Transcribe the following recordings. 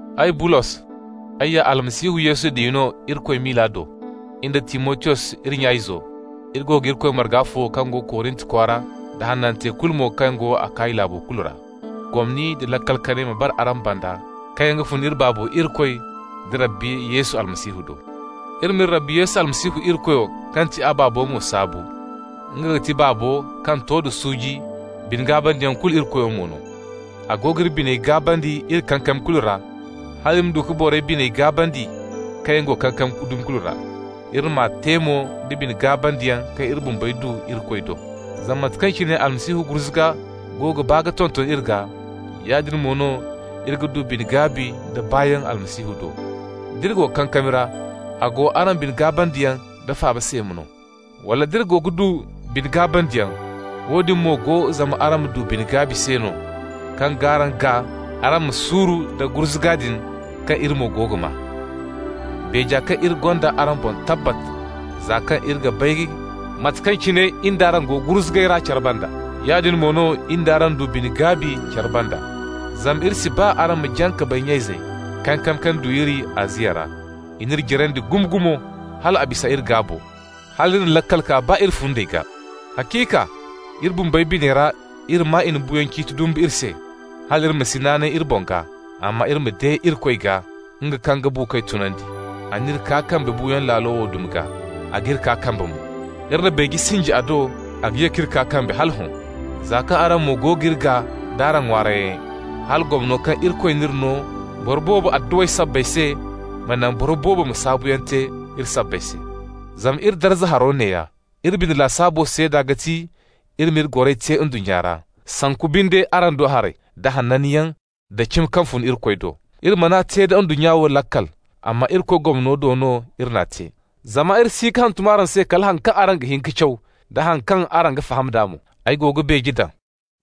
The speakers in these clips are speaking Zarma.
Ay, Bulos, ay ya Almasihu Yesu diya no Irikoy miila do. In da Timotiyos iri nya-izo, iri go ga Irikoy marga fo kaŋ go Korint kwaara, da hanantey kulu mo kaŋ yaŋ go Akaya laabo kulu ra. Gomni nda laakal kanay ma bara araŋ banda kaŋ yaŋ ga fun iri Baabo Irikoy da Rabbi Yesu Almasihu do. Iri m'iri Rabbi Yesu Almasihu Irikoyo kaŋ ti a Baabo mo saabu. Nga ga ti Baabo kaŋ to da suuji, bine-gaabandiyaŋ kulu Irikoyo mo no. A go g'iri biney gaabandi iri kankami kulu ra, hal iri ma du ka borey biney gaabandi kaŋ yaŋ go kankami dumi kulu ra. Iri m'a te mo da bine-gaabandiyaŋ kaŋ iri bumbey du Irikoy do. Zama mate kaŋ cine Almasihu gurzuga go ga baa ka tonton iri gaa, yaadin mo no iri ga du bine-gaabi nda baayaŋ Almasihu do. D'iri go kankami ra, a go araŋ bine-gaabandiyaŋ da faaba se no. Wala d'iri go ga du bine-gaabandiyaŋ, woodin mo go zama araŋ ma du bine-gaabi se no, kaŋ g'araŋ gaa araŋ ma suuru nda gurzuga din kaŋ iri mo go ga maa. Beeja kaŋ iri gonda araŋ boŋ tabbat, za kaŋ iri ga bay mate kaŋ cine in d'araŋ go gurzugay ra care banda, yaadin mo no in d'araŋ du bine-gaabi care banda. Zama iri si ba araŋ ma jaŋ ka bay, nya-izey, kankami kaŋ du iri Aziya ra. I n'iri jarandi gumo-gumo, hal a bisa iri gaabo, hal iri na laakal kaa baa iri fundey gaa. Haciika, iri bumbey biney ra iri maa i na buuyaŋ ciiti dumbu iri se, hal iri ma si naanay iri boŋ gaa, amma iri ma de Irikoy gaa, nga kaŋ ga buukoy tunandi. A n'iri kaa kambe buuyaŋ laalo wo dumi gaa, a g'iri kaa kambe mo. Iri na beeje sinji a do a ga ye k'iri kaa kambe hala hõ, za kaŋ araŋ mo go g'iri gaa d'araŋ ŋwaarayyaŋey, hala gomno kaŋ Irikoy n'iri no boro boobo adduwey sabbay se ma naŋ boro boobo ma saabuyaŋ te iri sabbay se. Zama iri darza haro neeya: iri bine lasaabo seeda ga ti iri n'iri goray te ndunnya ra, (sanku binde araŋ do haray), da hananyaŋ da cimi kaŋ fun Irikoy do. Iri man'a te da ndunnya wo laakal, amma Irikoy gomno do no iri n'a te. Zama iri si ga hantum araŋ se kala haŋ kaŋ araŋ ga hin ka caw da haŋ kaŋ araŋ ga faham d'a mo. Ay go ga beeje daŋ,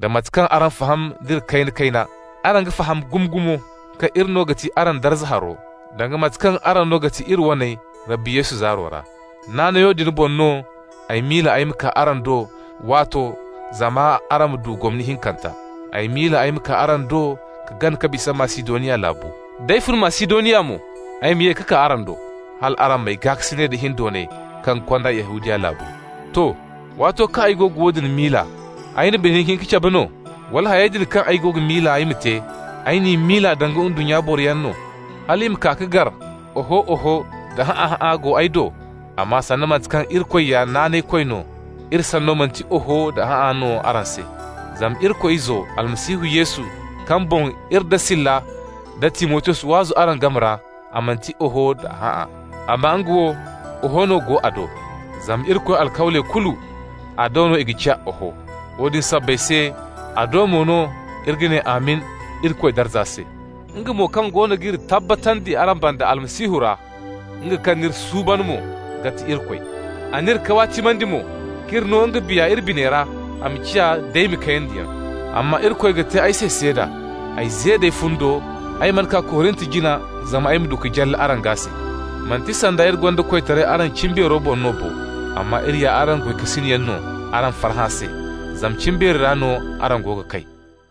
da mate kaŋ araŋ faham d'iri kayna-kayna, araŋ ga faham gumo-gumo, kaŋ iri no ga ti araŋ darza haro, danga mate kaŋ araŋ no ga ti iri waney Rabbi Yesu zaaro ra. Naanayo din boŋ no, ay miila ay ma kaa araŋ do waato zama araŋ ma du gomni hinkanta. Ay miila ay ma kaa araŋ do ka gana ka bisa Masidoniya laabu. D'ay fun Masidoniya mo, ay ma ye ka kaa araŋ do, hal araŋ m'ay gaakasinay da hindoonay kaŋ ga kond'ay Yahudiya laabu. To. Waato kaŋ ay go ga woodin miila, ay na bine hinka-hinka cabe no? Wala hayey din kaŋ ay go ga miila ay ma te, ay n'i miila danga ndunnya boroyaŋ no, hal i ma kaa ka gar oho-oho da hã'a-hã'a go ay do? Amma sanda mate kaŋ Irikoy ya naanaykoy no, iri sanno manti oho da hã'a no araŋ se. Zama Irikoy Izo, Almasihu Yesu, kaŋ boŋ iri nda Sila da Timotiyos waazu araŋ game ra, a manti oho da hã'a. Amma nga wo, oho no go a do. Zama Irikoy alkawley kulu, a do no i ga ciya oho. Woodin sabbay se a do mo no iri ga ne «Amin» Irikoy darza se. Nga mo kaŋ goono g'iri tabbatandi araŋ banda Almasihu ra, nga kaŋ n'iri suuban mo, ga ti Irikoy. A n'iri kawaatimandi mo k'iri no nga Biya iri biney ra a ma ciya daymi kayandiyaŋ. Amma Irikoy ga te ay se seeda, ay ze d'ay fundo ay mana kaa Korint jina zama ay ma du ka jalla araŋ gaa se. Manti sanda iri gonda koytaray araŋ cimbeero boŋ no bo. Amma iri ya araŋ goykasinyaŋ no araŋ farhã se, zama cimbeeri ra no araŋ go ga kay.